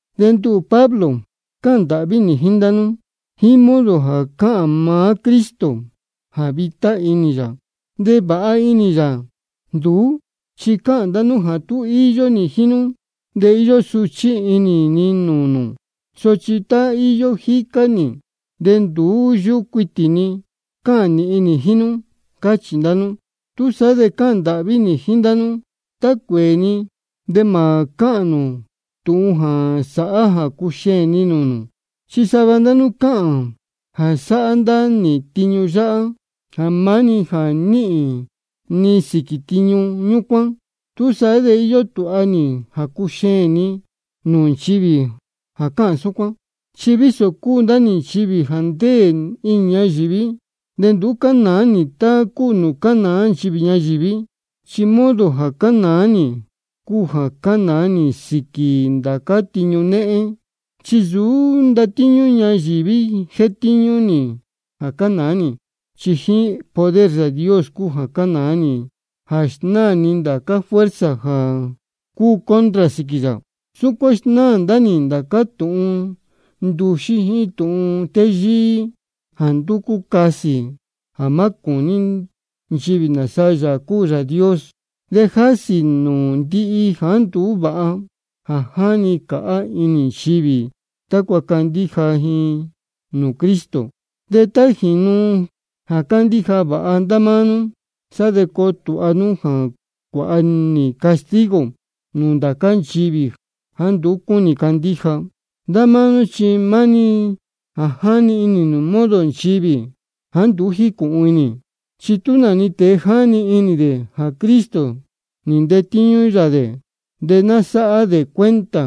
De nduhū Pablo, cáhān ndāhví nī jíín ndá nú jíín modo jā cáhān maá Cristo jā vitá inī yā de vāha inī yā. Nduhū, chi cáhān ndá nú jā tá íyó nī jíín nú de íyó suchí inī ni nūū nū, sochi tá íyó jícá nī de nduú yúhú cuitī ni cāhān nīhin nī jíín nú. Cáchī ndá nú. Túsaá de cáhān ndāhví nī jíín ndá nú jā tá cuēē ni de mā cáhān nū tūhun jā sāhá jā cuxeēn ni nūū nū. Chi sava ndá nú cáhān jā sáhá ndá nī tiñu yā jā maá-ni jā níhīn ni sīquī ñúcuán. Túsaá de íyó tūha nī jā cuxeēn ni nūū nchivī jā cáhān súcuán. Chi vísō cúu ndá nī nchivī jā ndéē inī ñayīví, de nduú cánāá nī tá cúu nūū cánāá nchivī ñayīví. Chi modo jā cánāá nī cúu jā cánāá nī sīquī ndācá tiñu néhén. Chi nsūú ndatíñú ñayīví jétíñú nī jā cánāá nī, chi jíín poder Yāā Dios cúu jā cánāá nī jā snáā ni ndācá fuerza jā cúu contra sīquī yā. Súcuán snáā ndá nī ndācá tūhun nduxí jíín tūhun téyíí jā ndúcú casī jā má cūní nchivī nāsa Yāā cúu Yāā Dios. De jásī ni nūū ndihi jāá nduú vāha jā jáni cāhá inī nchivī, tácua candíja ji nūū Cristo. De tá jīnu jā candíja vāha ndá máá nú, sá de coo tūha nī jā cuāha nī castigo nūū ndá cā nchivī jāá nduú cúnī candíja. Ndá máá nú chi maá-ni jā jáni inī nū modo nchivī jāá nduú jícūhun inī. Chi tú nā-ni tēe jáni inī dē jā Cristo nī ntetíñú yā dē, de ná sáhá dē cuenta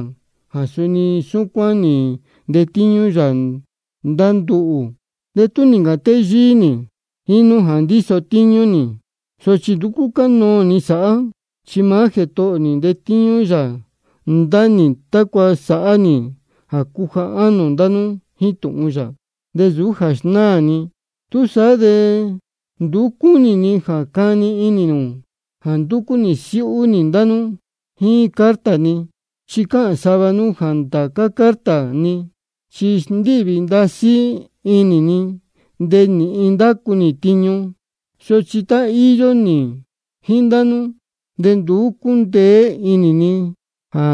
jā suni súcuán nī ntetíñú yā ndá nduhū. De tú nī ncāhān téyíí nī jíín nú jā ndíso tíñú nī, sochi nduú cúcanoō ni sáhá. Chi maá Jētohō ō nī ntetíñú yā ndá nī, tácua sāhá nī jā cuja ánō ndá nú jíín tūhun yā, de nsūú jā snáā ni. Túsaá de nduú cúnī ni jā cani inī nū jā ndúcú nī siúhú nī ndá nú jíín carta ni. Chi cáhān sava nú jā ndācá carta ni chi sndíhvī ndasí inī, de nīhin ndácu tiñu, sochi tá íyó nī jíín ndá nú de nduú cúndeé inī ni jā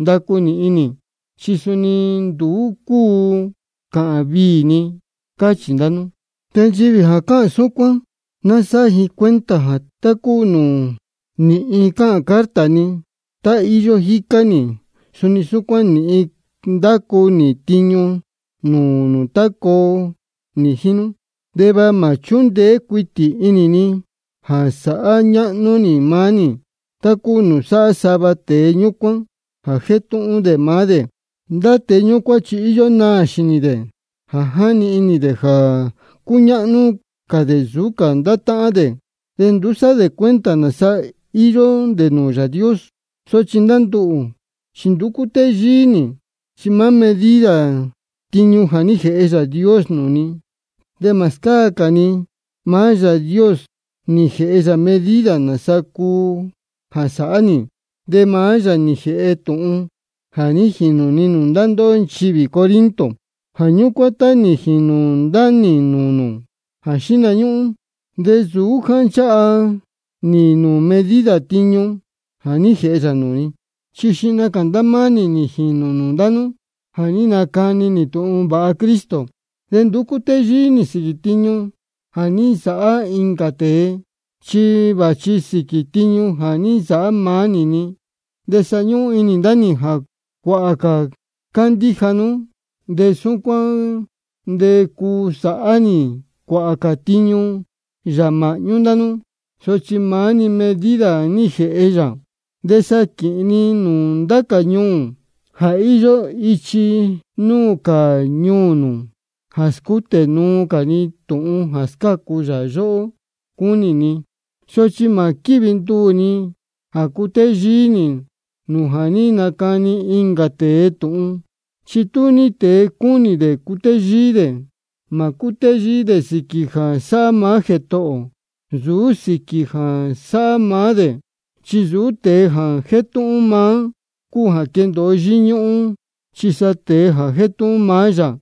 ndacu nīhin nī, de suni nduú cúu cāhān viī ni, cáchī ndá nú. De nchivī jā cáhān súcuán ná sáhá ji cuenta jā tá cúu nūū nīhin cáhān carta ni tá íyó jícá nī, suni súcuán nīhin ndacu nī tiñu nūū nū tá coo nī jíín nú. De va mā chúndeé cuitī inī ni jā sāhá ñáhnú nī maá nī tá cúu nūū sáhá sava tēe ñúcuán jā jétúhún dē maá dē. Ndá tēe ñúcuán chi íyó naā xīnī dē jā jáni inī dē jā cúñáhnú cā dē nsūú cā ndá táhán dē, de nduú sáhá dē cuenta nāsa íyó dē nūū Yāā Dios. Sochi ndá nduhū chi nduú cútéyíí nī, chi maá-ni medida tiñu jā ní jēhe Yāā Dios nūū ni, de mā scáa cā ni. Maá Yāā Dios nī jēhe medida nāsaa cúu jā sāhá nī, de maá yā nī jēhe tūhun jā ní jīnū ni nūū ndá ndóhó nchivī Corinto. Jā ñúcuán, tá nī jīnū ndá nī nūū nū jā xíhna ñúhún de nsūú jā ní nchāha nī nūū medida tiñu jā ní jēhe yā nūū ni. Chi xihna cā ndá máá nī nī jīnū nūū ndá nú jā ní nacani nī tūhun vāha Cristo. De nduú cútéyíí nī sīquī tiñu jā ní nsāhá incā tēe, chi vāchi sīquī tiñu jā ní nsāhá maá nī-ni. De sa ñúhún inī ndá nī jā cuāhā cā candíja nú, de súcuán de cuu sāhá nī cuāhā cā tiñu yā māhñú ndá nú, sochi maá-ni medida jā ní jēhe yā. De sá de quīhīn ni nūū ndá cā ñuū jā íyó ichi núū cā ñuū nū, jā scútē nuu cā ni tūhun jā scácu yā yóhó cúnī ni. Sochi mā quívi nduū ni jā cutéyíí nī nūū ja nī nacani incā tēe tūhun. De tú ní tēe cúnī dē cutéyíí dē, ná cútéyíí dē sīquī jā sáhá maá Jētohō ō, nsūú sīquī jā sáhá maá dē. Chi nsūú tēe jā jétúhún maá cúu jā quéndōo yíñúhún, chi sa tēe jā jétúhún maá yā.